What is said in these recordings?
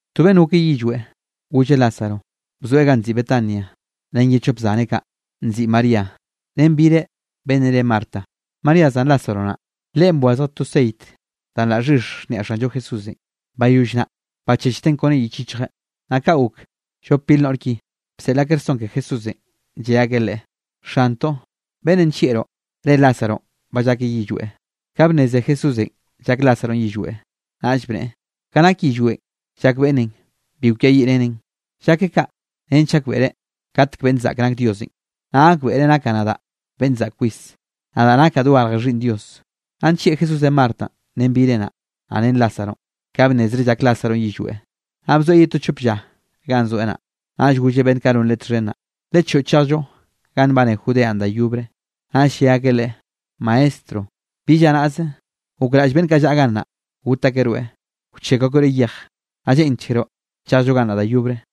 To beꞌnne gokeꞌ yillweꞌ, golle Lázaro bzoeꞌ ganꞌ nziꞌi Betania, ren ye chop zaneꞌ kaꞌ nziꞌi María ren bireꞌ, beꞌnnenꞌ re Marta. (María, zan Lázaro naꞌ, leꞌen bwazj to ceit danꞌ laꞌ xhix niaꞌ Xanllo Jesúsenꞌ, bayoll naꞌ, bachechteꞌn kone yich yichjeꞌ.) Naꞌ kaꞌ gok llop bir noꞌr ki, bseꞌl akeꞌ rson ke Jesúsenꞌ, lle akeꞌ Leꞌe: —Xantoꞌ, beꞌnnenꞌ nllieꞌroꞌ, re Lázaronꞌ ba llakeꞌ yillweꞌ. Ka bnneze Jesúsenꞌ llak Lázaronꞌ yillweꞌ, naꞌll bneꞌe: —Ka nak yillweꞌ llak beꞌnnenꞌ bi kwiayiꞌreneꞌn, llakeꞌ kaꞌ nench gakbeꞌre katek beꞌnn zaꞌk nak Diosenꞌ, naꞌ gakbeꞌre nakaꞌ nadaꞌ beꞌn zaꞌk kwis, nadaꞌ nakaꞌ dogarj Xhiꞌnn Dios. Naꞌ nllieꞌ Jesúsenꞌ Martanꞌ ren bireꞌ naꞌ, naꞌ ren Lázaronꞌ. Ka bnnezreꞌ llak Lázaronꞌ yillweꞌ, naꞌ bzoeꞌ ye to chop lla ganꞌ zoeꞌ naꞌ. Naꞌll golleꞌ beꞌnn kaꞌ non Leꞌe txhen naꞌ: —Lechoꞌo, chejllo ganꞌ nbane Judeanꞌ da yobre. Naꞌ lle akeꞌ Leꞌe: —Maestro, bi lla naꞌze gokraꞌll beꞌnn kaꞌ llaꞌa gannaꞌ, got akeꞌ rweꞌ, wchekw akeꞌ rweꞌ yej. ¿Naꞌ lleꞌnchkeroꞌ chejlloꞌ gannaꞌ da yobre?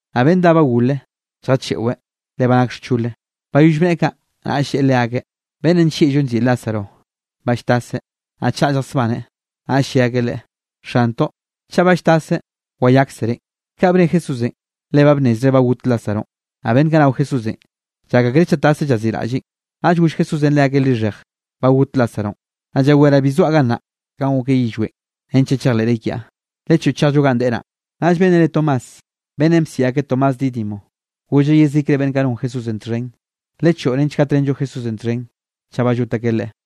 Naꞌ beꞌnn dá ba gole lljacheꞌweꞌ, le ba nak xchole. Bayoll bneꞌe kaꞌ, naꞌll lleꞌe leakeꞌ: —Beꞌnnenꞌ nllieꞌllo nziꞌi Lázaronꞌ ba lltaseꞌ, naꞌ chaꞌa lljasbaneꞌ. Naꞌll lle akeꞌ Leꞌe: —Xantoꞌ, chaꞌ ba lltaseꞌ, wayakzereꞌn. Kaꞌ bne Jesúsenꞌ, le ba bnnezreꞌ ba got Lázaronꞌ, naꞌ beꞌnn kaꞌ nao Jesúsenꞌ, llak akreꞌ chaꞌ taszeꞌ llaziꞌraꞌlleꞌn. Naꞌll goll Jesúsenꞌ leakeꞌ lixheje: —Ba got Lázaronꞌ. Naꞌ llaweraꞌ bi bzoaꞌ gannaꞌ kanꞌ gokeꞌ yillweꞌn, nench naꞌ chejleꞌre kiaꞌ. Lechoꞌo chejllo ganꞌ deꞌe naꞌ. Naꞌll beꞌnnenꞌ re Tomás, beꞌnnenꞌ bsiꞌi akeꞌ Tomás Dídimo golleꞌ yezikre beꞌnn kaꞌ non Jesúsenꞌ txhen: —Lechoꞌo nench gatrenllo Jesúsenꞌ txhen, chaꞌ ba llot akeꞌ Leꞌe.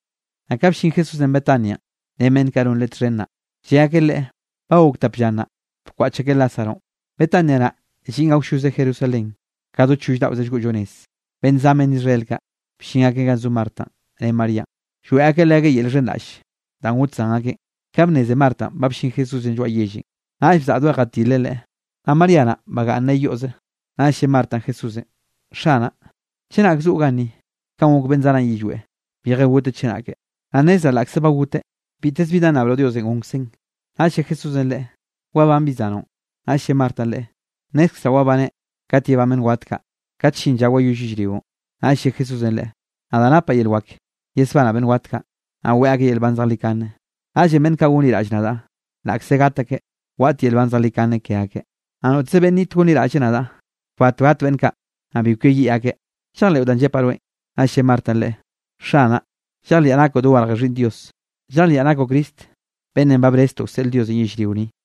Naꞌ ka bllin Jesúsenꞌ Betanianꞌ ren beꞌnn kaꞌ non Leꞌe txhen naꞌ, lle akeꞌ Leꞌe ba gok tap lla nnaꞌ, bkwaꞌch akeꞌ Lázaronꞌ. Betania naꞌ, lliꞌn awlloze Jerusalén ka do choll daꞌoze llgoꞌllo nez. Beꞌnn zan beꞌnn Israel kaꞌ, bllin akeꞌ ganꞌ zo Martanꞌ ren Maríanꞌ, lloeꞌ akeꞌ leakeꞌ yel llxhenraꞌlle danꞌ got zan akeꞌn. Ka bnneze Martanꞌ ba bllin Jesúsenꞌ lloaꞌ yellenꞌ, naꞌll bzaꞌdoeꞌ jatileꞌ Leꞌe, naꞌ María naꞌ bagaꞌnneꞌ yoꞌze. Naꞌll lle Martanꞌ Jesúsenꞌ: —Xanaꞌ, chenak zoꞌo ganni kanꞌ gok beꞌnn zanaꞌn yillweꞌ, bije goteꞌ chenake. Naꞌ nnezraꞌ laꞌkze ba goteꞌ, biteze bi da nnabroꞌ Diosenꞌ gonkzeꞌn. Naꞌll lle Jesúsenꞌ leꞌe: —Wabán bi zanoꞌn. Naꞌll lle Martanꞌ Leꞌe: —Nnézkzeraꞌ wabaneꞌ kat yebán beꞌnn wat kaꞌ, kat llin lla wayoll yellrionꞌ. Naꞌll lle Jesúsenꞌ leꞌe: —Nadaꞌ napaꞌ yel wak yesbanaꞌ beꞌnn wat kaꞌ, naꞌ weꞌe akeꞌ yel nban zejlikane. Naꞌllenꞌ beꞌnn kaꞌ gonliraꞌll nadaꞌ, laꞌkze gat akeꞌ, waꞌt yel nban zejlikane ke akeꞌ. Naꞌ noteze beꞌnn niꞌt gonliraꞌlle nadaꞌ, kbat gat beꞌnn kaꞌ, naꞌ bi kweyiꞌ akeꞌ. ¿Llejleꞌo danꞌ llepaꞌ rweꞌn? Naꞌll lle Martanꞌ Leꞌe: —Xanaꞌ, llejliaꞌ nakoꞌ dogarje Xhiꞌnn Dios, llejliaꞌ nakoꞌ Cristo beꞌnnenꞌ ba breztoꞌ wseꞌl Diosenꞌ yellrio ni.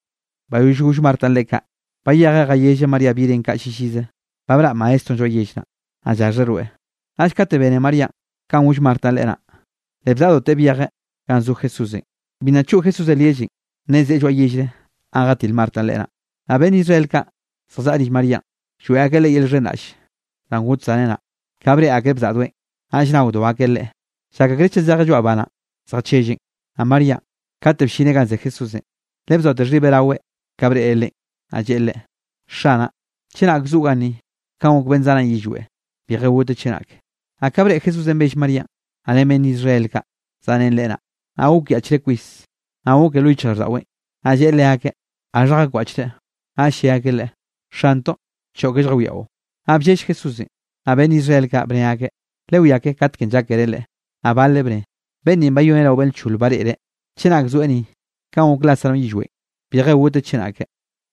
Bayoll goll Martanꞌ Leꞌe kaꞌ, bayejeꞌ jayelleꞌ María bireꞌn kaꞌ llillize: —Ba braꞌ Maestronꞌ lloaꞌ yell naꞌ, naꞌ llaxheꞌ rweꞌ. Naꞌll kate bene Maríanꞌ kanꞌ goll Martanꞌ leꞌe naꞌ, le bzaꞌdoteꞌ byejeꞌ ganꞌ zo Jesúsenꞌ. Bi nna choꞌ Jesúsenꞌ lyellenꞌ, naꞌ zeꞌe lloaꞌ yellre ganꞌ jatil Martanꞌ Leꞌe naꞌ. Naꞌ beꞌnn Israel kaꞌ, zjallaꞌa rill Maríanꞌ, lloeꞌ akeꞌ leꞌe yel llxhenraꞌll danꞌ got zaneꞌ naꞌ. Ka breꞌe akreꞌ bzaꞌdoeꞌn, naꞌll naodo akeꞌ leꞌe, llak akreꞌ chaꞌ zejeꞌ lloaꞌ ba naꞌ zjachelleꞌn. Naꞌ Maríanꞌ, kate bllineꞌ ganꞌ ze Jesúsenꞌ, le bzoate xhibeꞌ raweꞌ ka breꞌreꞌ Leꞌen, naꞌ lleꞌe Leꞌe: —Xanaꞌ, chenak zoꞌo ganni kanꞌ gok beꞌnn zanaꞌn yillweꞌ, bije gotjeꞌ chenake. Naꞌ ka breꞌe Jesúsenꞌ bell Maríanꞌ, naꞌ ren beꞌnn Israel kaꞌ zaꞌrén leꞌe naꞌ, naꞌ gokyaꞌchreꞌ kwis naꞌ gokeꞌ lo yichjraꞌlldaꞌweꞌn. Naꞌ lleꞌe leakeꞌ: —¿Gaxha jakwaꞌchreꞌ? Naꞌll lle akeꞌ Leꞌe: —Xantoꞌ, choꞌke lljawiaꞌo. Naꞌ bllell Jesúsenꞌ. Naꞌ beꞌnn Israel kaꞌ, bne akeꞌ: —Lewiake katekenꞌ llákereꞌ leꞌe. Naꞌ baleꞌ bne: —Beꞌnn ni bayoneꞌ rao beꞌnn lcholenꞌ bareꞌreꞌ, chenak zoeꞌ ni, kanꞌ gok Lázaronꞌ yillweꞌn, bije goteꞌ chenake.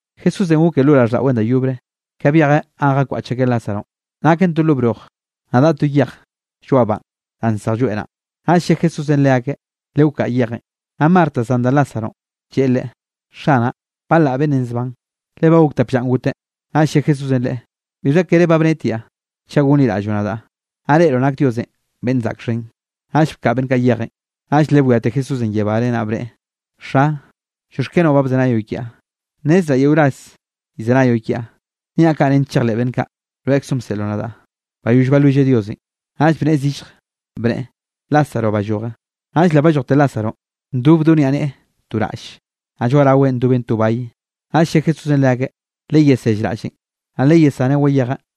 Jesúsenꞌ gokeꞌ lo raꞌlldaꞌweꞌn da yobre. Ka byejeꞌ ganꞌ jakwaꞌch akeꞌ Lázaronꞌ, naken to broj, naꞌ daꞌa to yej lloaꞌ banꞌ da nsej lloeꞌ naꞌ. Naꞌll lle Jesúsenꞌ leakeꞌ: —Lewkaꞌa yejenꞌ. Naꞌ Marta zan da Lázaronꞌ, lleꞌe Leꞌe: —Xanaꞌ, ba laꞌ beꞌnnenꞌ zban, le ba gokte tap llanꞌ goteꞌ. Naꞌll lle Jesúsenꞌ leꞌe: —¿Bixha kere ba bnetiaꞌ, chaꞌ gonliraꞌlloꞌ nadaꞌ, naꞌ reꞌroꞌ nak Diosenꞌ beꞌnn zaꞌk xhen? Naꞌll bkaꞌa beꞌnn kaꞌ yejenꞌ, naꞌll le bwiate Jesúsenꞌ yebáre, naꞌ bneꞌe: —Xa, llioxkenoꞌ ba bzenayoꞌ kiaꞌ. Nnezraꞌ yeo ras llzenayoꞌ kiaꞌ, niaꞌ kaꞌ nench chejleꞌ beꞌnn kaꞌ, rweꞌkzoꞌn bseꞌloꞌ nadaꞌ. Bayoll balwilleꞌ Diosenꞌ, naꞌll bnneꞌe zillje, bneꞌe: —¡Lázaro, balloje! Naꞌll le ballojte Lázaronꞌ ndob do niaꞌneꞌe to raꞌlle, naꞌ lloaꞌ raweꞌn ndoben to bay. Naꞌll lle Jesúsenꞌ leakeꞌ: —Leyesell raꞌllenꞌ, naꞌ leyesaneꞌ wayejeꞌ.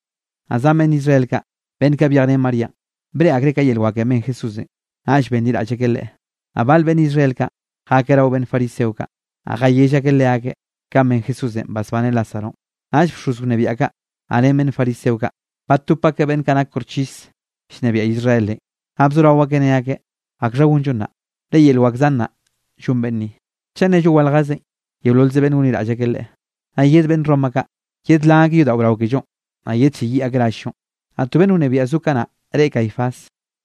Naꞌ zan beꞌnn Israel kaꞌ, beꞌnn kaꞌ byej ren Maríanꞌ, breꞌe akreꞌ ka yel wakenꞌ ben Jesúsenꞌ, naꞌll benliraꞌll akeꞌ Leꞌe. Naꞌ bal beꞌnn Israel kaꞌ, jakeꞌ rao beꞌnn fariseo kaꞌ, naꞌ jayell akeꞌ leakeꞌ kanꞌ ben Jesúsenꞌ basbaneꞌ Lázaronꞌ. Naꞌll bxoz wnebiaꞌ kaꞌ, naꞌ ren beꞌnn fariseo kaꞌ, batop akeꞌ beꞌnn kaꞌ nak koxchis llnebiaꞌ Israelenꞌ. Naꞌ bzorao akeꞌ ne akeꞌ: —¿Akxha gonllo nnaꞌ? Le yel wak zan naꞌ, llon beꞌnn ni. Chaꞌ nnello waljezen, yeololze beꞌnn gonliraꞌll akeꞌ Leꞌe, naꞌ yed beꞌnn Roma kaꞌ yedlan akeꞌ yodaꞌo brao kellonꞌ, naꞌ yedlleyiꞌ akeꞌ rall-llonꞌ. Naꞌ to beꞌnn wnebiaꞌ zo kanaꞌ reꞌe Caifás.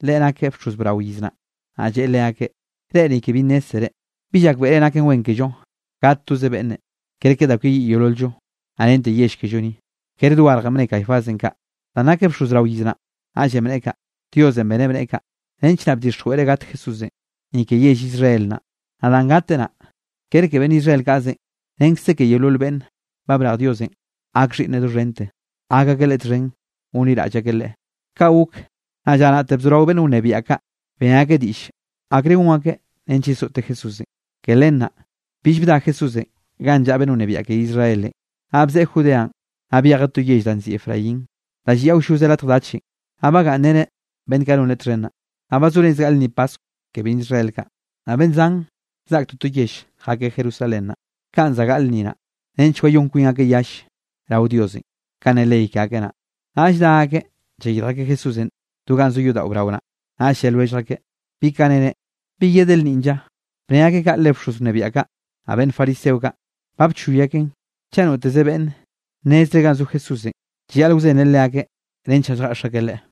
Leꞌe nakeꞌ bxoz brao iz naꞌ, naꞌ lleꞌe leakeꞌ: —Reꞌ ni ke bi nnézzere. Bi llakbeꞌre naken wen kello gat toze beꞌnne, kerke da kweyiꞌ yeolol-llo, naꞌ rente yell kello ni. Kere dogarjenꞌ bne Caifásenꞌ kaꞌ, danꞌ nakeꞌ bxoz brao iz naꞌn, naꞌllenꞌ bneꞌe kaꞌ, Diosenꞌ beneꞌ bneꞌe kaꞌ, nench naꞌ bdixjweꞌreꞌ gat Jesúsenꞌ, ni ke yell Israel naꞌ. Naꞌ danꞌ gateꞌ naꞌ, kere ke beꞌnn Israel kaꞌze, renkze ke yeolol beꞌnn ba brej Diosenꞌ gak xhiꞌnneꞌ doxhente, gak akeꞌ Leꞌe txhen gonliraꞌll akeꞌ Leꞌe. Kaꞌ gok, naꞌ lla naꞌte bzorao beꞌnn wnebiaꞌ kaꞌ, ben akeꞌ diꞌll akre gon akeꞌ nench yesoꞌte Jesúsenꞌ. Ke len naꞌ, bill bda Jesúsenꞌ ganꞌ llaꞌa beꞌnn wnebiaꞌ ke Israelenꞌ, naꞌ bzeꞌe Judeanꞌ, naꞌ byejeꞌ to yell da nziꞌi Efraín danꞌ lliꞌ awlloze latj dachenꞌ, naꞌ bagaꞌnnreneꞌ beꞌnn kaꞌ non Leꞌe txhen naꞌ. Naꞌ ba zo rez gaꞌle lnni paskw ke beꞌnn Israel kaꞌ. Naꞌ beꞌnn zan zaꞌk toto yell jakeꞌ Jerusalén naꞌ, kanꞌ za gaꞌl lnni naꞌ, nench wayón kwin akeꞌ yall rao Diosenꞌ kanꞌ ne ley ke akeꞌ naꞌ. Naꞌll dá akeꞌ llayirj akeꞌ Jesúsenꞌ do ganꞌ zo yodaꞌo brao naꞌ, naꞌll lle lwellj akeꞌ: —¿Bi ka nere? ¿Bi yedeꞌ lnninꞌ lla? Bne akeꞌ kaꞌ le bxoz wnebiaꞌ kaꞌ, naꞌ beꞌnn fariseo kaꞌ, ba bchoy akeꞌn chaꞌ noteze beꞌnn nnezreꞌ ganꞌ zo Jesúsenꞌ, llayaꞌl wzenreꞌ leakeꞌ nench naꞌ lljeꞌx akeꞌ Leꞌe.